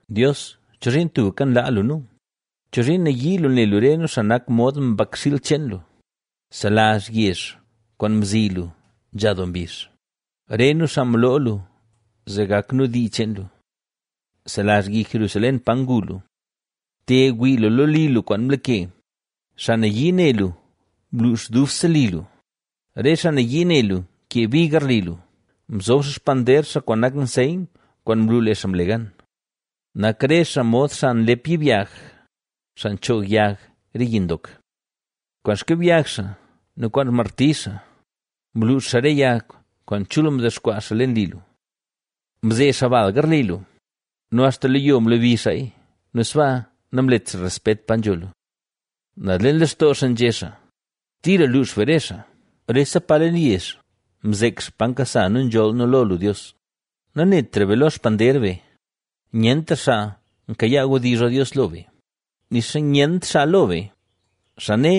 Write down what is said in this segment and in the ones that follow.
Dios, ¿chozhiin tubka nlaa lu nu? ¿Chozhiin nayii lu ne lu re nu, xaa nak mod mbakxiil cheen lu? Selazh yezh kwaan mzi lu nzha doo mbizh, re nu xaa mloo lu zee gak nu dii cheen lu. Selazh Yi Jerusalén pa ngu lu. Te, wii lu lo li lu kwaan mlake; ¡xaa nayii ne lu mluux dubse li lu! Re xaa nayii ne lu nkee bi garli lu; mzob xaa xpander xaa kwaan nak nseyn, kwaan nlu lee xaa mle gan. Nak re xaa mod xaa nlep yibyag, xaa nchoog yag re yi ndok. Kwaan xkibyag xaa nu kwaan xmarti xaa, mluux xaa re yag kwaan chul mdexkwaa xaa leen li lu. Mzee xaa bal garli lu nu axta lo yo mlebi xaaya nu sbaa namlet xaa respet pa nzho lu. Naz leen lextoo xaa nzhé xaa: “¡Tira luux be re xaa!” ¡Rese pa leen yezh mzek xaa pa nkasa nu nzholl nu lo lu, Dios! ¡Nanetra be lo xpander be; nyentra xaa nkayaa wdizh lo Dios lo be, nixa nyent xaa lo be, xaa né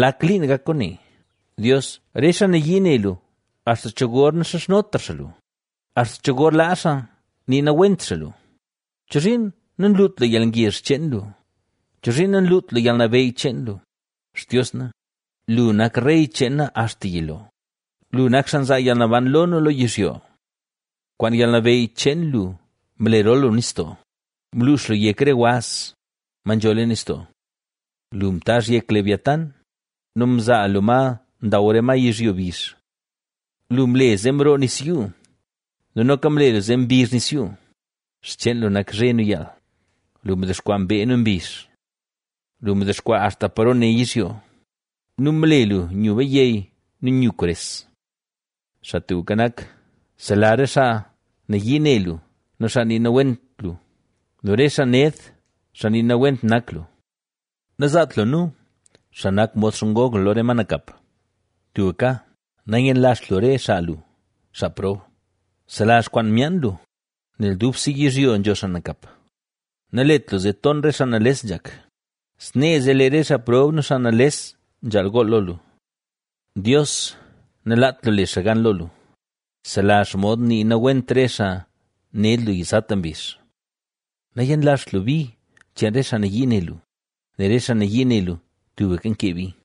lak liin gak kwaane! Dios, ¿re xaa nayii ne lu axta cho gor naxizhnotra xaa lu? ¿Axta cho gor laa xaa nii nawent xaa lu? ¿Chozhiin nanlut lu yalngezh cheen lu? ¿Chozhiin nanlut lu yalnabeyy cheen lu? Xtios na, lu nak rey cheen na axta yilo; lu nak xaa nzaa yalnaban lo nu lo yizhyo. Kwaan yalnabeyy cheen lu mlerol lu nistoo, mluux lu yek re waz, ma nzho leen nistoo. Lu mtaazh yek Leviatánb nu mzaa lu ma ndaw re ma yizhyo bizh. Lu mle zee mroo nis yuu nu noka mle lu zee mbizh nis yuu. Xcheen lu nak zhe nu yaal; lu mdexkwaa mbee nu mbizh. Lu mdexkwaa axta paro ne yizhyo nu mle lu nyu bayey nu nyu kwares. Xaa Tubka Nak, selazh re xaa nayii ne lu, nu xaa nii nawent lu nu re xaa ned, xaa nii nawent nak lu. ¡Nazaat lu nu, xaa nak mod xngog lu lo re ma nakap! ¡Tubka nanyenlazht lu re xaa lu, xaa prob! Bselazh kwaan myaan lu, nel dubse yizhyo nzho xaa nakap. Nalet lu zee ton re xaa nales nzhak, snee zee lee re xaa prob nu xaa nales nzhaal gool lo lu. Dios, nalaat lu le xaa gan lo lu; selazh xomod nii nawent re xaa ned lu yizata mbizh. Nanyenlazht lu bi cheen re xaa nayii ne lu, nel re xaa nayii ne lu tubka nkee bi.